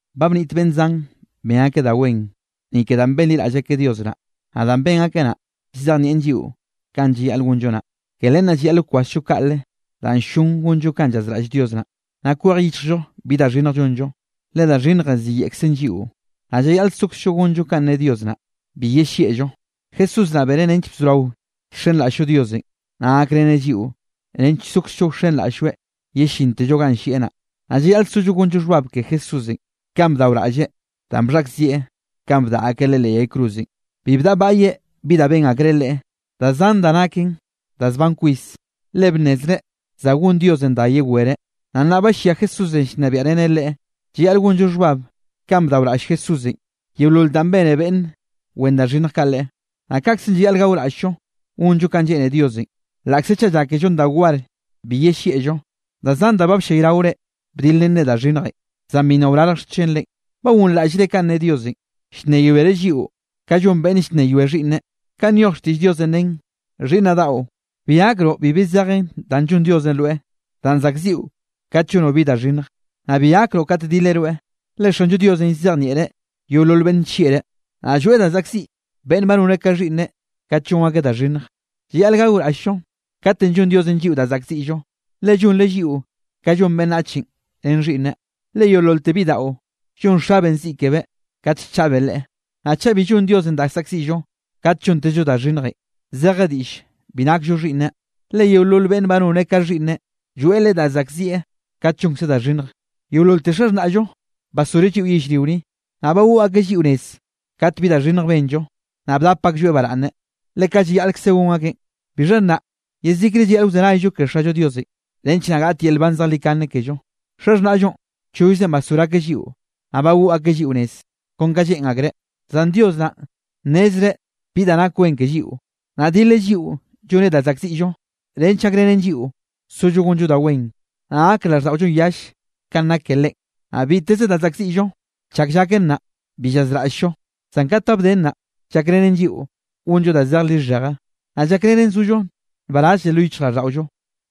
Ba bniꞌt beꞌnn zan ben akeꞌ da wen, ni ke danꞌ benliraꞌll akeꞌ Dios naꞌ, naꞌ danꞌ ben akeꞌ naꞌ, llzejnieꞌn lliꞌo kanꞌ llayaꞌl gonllo naꞌ. Ke len naꞌ llayaꞌl wkwasllo kaꞌle danꞌ ll-llon gonllo kanꞌ llazraꞌll Dios naꞌ, naꞌ kwej yichllo bi da xhinnj llonllo, le da xhinnjenꞌ ziyeꞌkzen lliꞌo. Naꞌ llayaꞌl sokzllo gonllo kanꞌ ne Dios naꞌ bi yellieꞌllo. Jesús naꞌ beneꞌ nench bzorao llxenraꞌll-llo Diosenꞌ, naꞌ gakreneꞌ lliꞌo nench sokzllo wxenraꞌll-lloeꞌ yellintello ganꞌ llieꞌ naꞌ. Naꞌ llayaꞌl sollo gonllo xhbab ke Jesúsenꞌ, kanꞌ bdaoraꞌlleꞌ danꞌ bxhaꞌkzieꞌ kanꞌ bdaꞌa akeꞌ Leꞌe leꞌ yay cruzenꞌ. Bi bdaꞌbaꞌyeꞌ bi danꞌ ben akreꞌ Leꞌe, da zan da naken da zban kwis, le bnnezreꞌ za gon Diosenꞌ da yewereꞌ. Naꞌ nnaꞌ ba llia Jesúsenꞌ llnebiaꞌreneꞌ Leꞌe. Llayaꞌl gonllo xhbab kanꞌ bdaoraꞌll Jesúsenꞌ yeolol danꞌ bene beꞌnn wen da xhinnj kaꞌ Leꞌe. Naꞌ kaꞌkzenꞌ llayaꞌl gaoraꞌll-llo gonllo kanꞌ lleꞌne Diosenꞌ, laꞌkze chaꞌ llákellon da war bi yellieꞌllo. Da zan da ba bllayraore dilrenre da xhinnjenꞌ, zan bi nna wrarj xchenre. ¿Ba gonraꞌllre kanꞌ ne Diosenꞌ, llnneyoereꞌ lliꞌo ka llon beꞌnn llnneyoe xhiꞌnneꞌ? Kanꞌ nyoj xtiꞌll Diosenꞌ nen: Xhiꞌnnaꞌ daꞌo, bi gakroꞌ bibi zejen danꞌ llonn Diosenꞌ rweꞌ, danꞌ zaꞌkziꞌo kat llonoꞌ bi da xhinnj, naꞌ bi gakroꞌ kat dileꞌ rweꞌ. Le Xanllo Diosenꞌ llzejnieꞌreꞌ yeolol beꞌnn nllieꞌreꞌ, naꞌ lloeꞌ da zaꞌkziꞌ beꞌnn ba noneꞌ ka xhiꞌnneꞌ kat llon akeꞌ da xhinnj. Llayaꞌl gaoraꞌll-llo katenꞌ llonn Diosenꞌ lliꞌo da saꞌkziꞌllo, le llonreꞌ lliꞌo ka llon beꞌnnachenꞌ ren xhiꞌnneꞌ. Le yeololte bidaꞌo, llon xabeꞌn ziꞌ kebeꞌ kate llchaꞌbeꞌ leꞌe. Naꞌ chaꞌ bi llonn Diosenꞌ da saꞌkziꞌllo kat llontezllo da xhinnjenꞌ, zeje diꞌll bi nakllo xhiꞌnneꞌ, le yeolol beꞌnne ba noneꞌ ka xhiꞌnneꞌ, lloeꞌ leꞌe da saꞌkzieꞌ kat llonkzeꞌ da xhinnj. Yeololte xaxhnaꞌllo basgoreꞌ lliꞌo yellrio ni, naꞌ bagoꞌ akeꞌ lliꞌo nez kat bi da xhinnj benllo, naꞌ bdap aklloeꞌ baraꞌnne, le kaꞌ llayaꞌlkze gon akeꞌn. Bixha nnaꞌ yezikre llayaꞌl wzenayllo ke Xallo Diosenꞌ, nench naꞌ gaꞌt yel nban zejlikane kello. Xaxhnaꞌllonꞌ chollzenꞌ basgor akeꞌ lliꞌo, naꞌ bagoꞌ akeꞌ lliꞌo nez kon ka lleꞌn akreꞌ. Zan Dios naꞌn nnezreꞌ bi da nak wen ke lliꞌo, naꞌ dileꞌ lliꞌo llonneꞌ da saꞌkziꞌllo, nench gakrenen lliꞌo sollo gonllo da wen, naꞌ gak raꞌlldaꞌollonꞌ yalle kanꞌ nak ke Leꞌen. Naꞌ biteze da zaꞌkziꞌllo, chak llaken naꞌ, bi llazraꞌll-llo, zan kat ba bden naꞌ, llakrenen lliꞌo gonllo da zej lixheje, naꞌ llakrenen sollo nbarazlle lo yichjraꞌlldaꞌollo.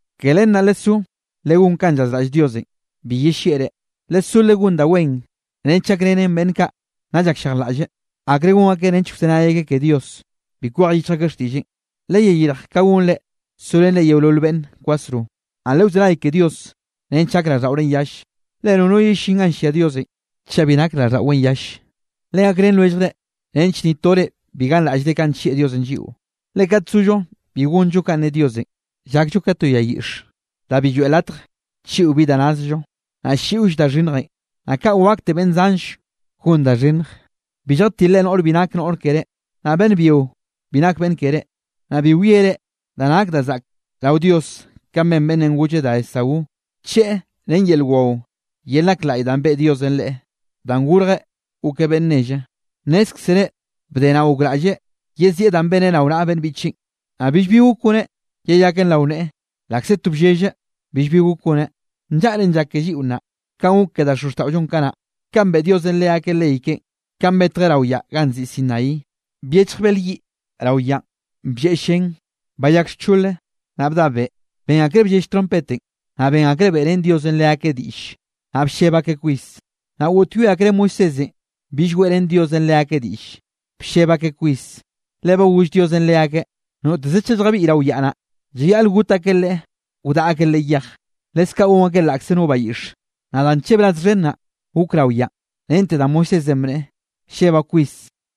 Ke len naꞌ lesó legón kanꞌ llazraꞌll Diosenꞌ bi yellieꞌre. Lesó legón da wen nench gakrenen beꞌnn kaꞌ nna llakllejlaꞌlle, akre gon akeꞌ nench wzenay akeꞌ ke Dios, bi kwej yichj akeꞌ xtiꞌlleꞌn. Leyeyirj ka gonre sorenre yeolol beꞌnn kwasro, naꞌ lewzenay ke Dios nench gak raꞌlldaꞌorenꞌ yalle, le nono yellín ganꞌ llia Diosenꞌ chaꞌ bi nak raꞌlldaꞌweꞌn yalle. Legakrén lwelljre nench ni tore bi ganraꞌllre kanꞌ nllieꞌ Diosenꞌ lliꞌo, le kat sollo bi gonllo kanꞌ ne Diosenꞌ, llakllo ka to yay yiꞌx da bi lloeꞌ latj chiꞌo bi da nazllo, naꞌ ll-lliꞌoll da xhinnjenꞌ, naꞌ kaꞌ wakte beꞌnn zanll gon da xhinnj. Bi lljatilre noꞌre bi nak noꞌr keré, naꞌ beꞌnn byio bi nak beꞌnn keré. Naꞌ bi wiere da nak da zaꞌk rao Dios kanꞌ ben beꞌnnenꞌ golle da Esaú, bcheꞌe ren yel wao, yel nak laꞌy danꞌ beꞌe Diosenꞌ leꞌe danꞌ gorjeꞌ gokeꞌ beꞌnn nelle. Nnézkzere bde naꞌ gokraꞌlleꞌ yezieꞌ danꞌ beneꞌ rao naꞌa beꞌnn biꞌcheꞌn, naꞌ billbi gok goneꞌ yeyakeꞌn rao neꞌe, laꞌkze to bllelleꞌ billbi gok goneꞌ. Nllaꞌren llak ke lliꞌo nnaꞌ, kanꞌ gok ke da xozxtaꞌollonꞌ kanaꞌ, kanꞌ beꞌe Diosenꞌ leakeꞌ ley keꞌen. Kanꞌ betjeꞌ rao yaꞌ ganꞌ nziꞌi Sinaí, byechj bel yiꞌ rao yaꞌn blleꞌ llen, bayak xchole, naꞌ bda beꞌ. Ben akreꞌ bllell trompetenꞌ, naꞌ ben akreꞌ beꞌrén Diosenꞌ leakeꞌ diꞌlle. Naꞌ blleb akeꞌ kwis, naꞌ goꞌtyoe akreꞌ Moisésenꞌ bill weꞌrén Diosenꞌ leakeꞌ diꞌlle. Blleb akeꞌ kwis, le ba goll Diosenꞌ leakeꞌ noteze chaꞌ lljabiꞌy rao yaꞌ naꞌ, llayaꞌl got akeꞌ leꞌe wdaꞌa akeꞌ leꞌe yej, leskaꞌ gon akeꞌ laꞌkze no bayiꞌxe. Naꞌ da nllebraz xhen naꞌ gok rao yaꞌn, rente da Moisésenꞌ bneꞌe: “Llebaꞌ kwis,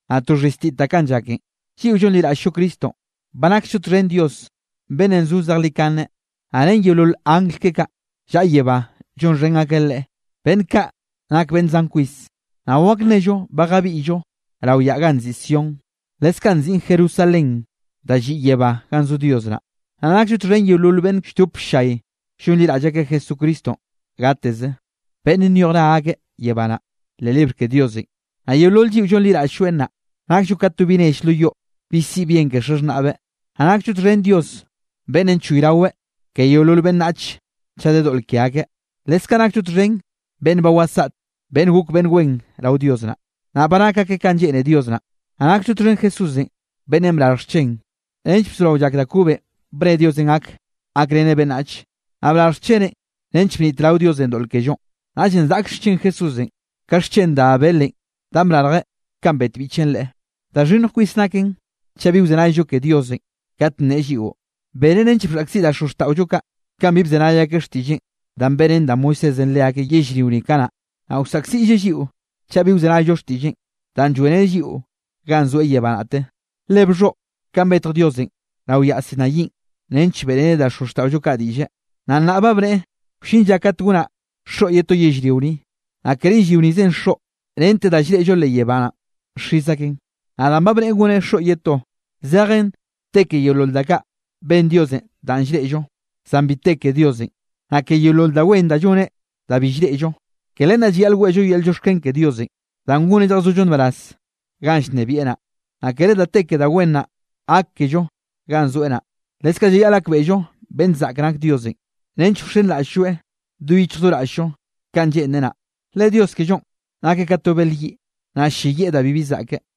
naꞌ to xhiztitaꞌ kanꞌ llaken.” Lliꞌo llonliraꞌll-llo Cristonꞌ, ba naksllo txhen Dios beꞌnn zo zejlikane, naꞌ ren yeolol angl keꞌe kaꞌ llaꞌa yebá llonxhen akeꞌ Leꞌe, beꞌnn kaꞌ nak beꞌnn zan kwis. Naꞌ wak nnello ba jabiꞌyllo rao yaꞌ ganꞌ nziꞌi Sión, leskaꞌ nziꞌn Jerusalén da lliꞌ yebá ganꞌ zo Dios naꞌ. Naꞌ nakllo txhen yeolol beꞌnn lldop ll-llay llonliraꞌll akeꞌ Jesucristonꞌ gateze, beꞌnn nyoj ra akeꞌ yebá naꞌ, leꞌ libr ke Diosenꞌ. Naꞌ yeolol lliꞌo llonliraꞌll-lloeꞌ naꞌ, nakllo ka to bi nell lo yoꞌ, bi siꞌi bien ke xaxhnaꞌbeꞌ. Naꞌ nakllo txhen Dios beꞌnnenꞌ choyraweꞌ ke yeolol beꞌnnach chaꞌ de doꞌl ke akeꞌ. Leskaꞌ nakllo txhen beꞌnn ba wasaꞌte, beꞌnn gok beꞌnn wen rao Dios naꞌ, nnaꞌ ba nak akeꞌ kanꞌ lleꞌne Dios naꞌ. Naꞌ nakllo txhen Jesúsenꞌ beꞌnnenꞌ brarj xchen, nench bzorao llak da kobenꞌ bne Diosenꞌ gak gakreneꞌ beꞌnnach. Naꞌ brarj xcheneꞌn nench bnitrao Diosenꞌ doꞌl kellonꞌ. Naꞌllenꞌ zaꞌkll xchen Jesúsenꞌ, ka xchen da Abelenꞌ danꞌ brarjeꞌ kanꞌ bet biꞌcheꞌn leꞌe. Da xhinnj kwis naken chaꞌ bi wzenayllo ke Diosenꞌ kate nneꞌe lliꞌo. Beneꞌ nench bxhaꞌkziꞌ da xozxtaꞌollo kaꞌ, kanꞌ bi bzenay akeꞌ xtiꞌlleꞌn danꞌ beꞌrén da Moisésenꞌ leakeꞌ yellrio ni kanaꞌ, naꞌ wsaꞌkziꞌlleꞌ lliꞌo chaꞌ bi wzenayllo xtiꞌlleꞌn, danꞌ lloeꞌreneꞌ lliꞌo ganꞌ zoeꞌ yebá naꞌte. Le bxhoꞌ kanꞌ betj Diosenꞌ rao yaꞌ Sinaínꞌ nench beꞌreneꞌ da xozxtaꞌollo kaꞌ diꞌlle. Naꞌ nnaꞌ ba bneꞌe: “Wllin lla kat gonaꞌ xoꞌ ye to yellrio ni, naꞌ kere yellrio nizenꞌ xoꞌ, rente da llreꞌllo leꞌ yebá naꞌn xiz aken.” Naꞌ danꞌ ba bneꞌe goneꞌ xoꞌ ye to, zejen te ke yeolol da kaꞌ ben Diosenꞌ danꞌ llreꞌllo, zan bi te ke Diosenꞌ, naꞌ ke yeolol da wen da lloneꞌ da bi llreꞌllo. Ke len naꞌ llayaꞌl weꞌllo yel llioxken ke Diosenꞌ, danꞌ goneꞌ lljazollo nbaraz ganꞌ llnebieꞌ naꞌ, naꞌ kere da te ke da wen naꞌ gak kello ganꞌ zoeꞌ naꞌ. Leskaꞌ llayaꞌl gakbeꞌllo beꞌnn zaꞌk nak Diosenꞌ, nench wxenraꞌll-lloeꞌ do yichj do raꞌll-llo kanꞌ lleꞌnreꞌ naꞌ. Le Dios kellonꞌ nakeꞌ ka to bel yiꞌ, naꞌ ll-lleyieꞌ da bibi zaꞌke.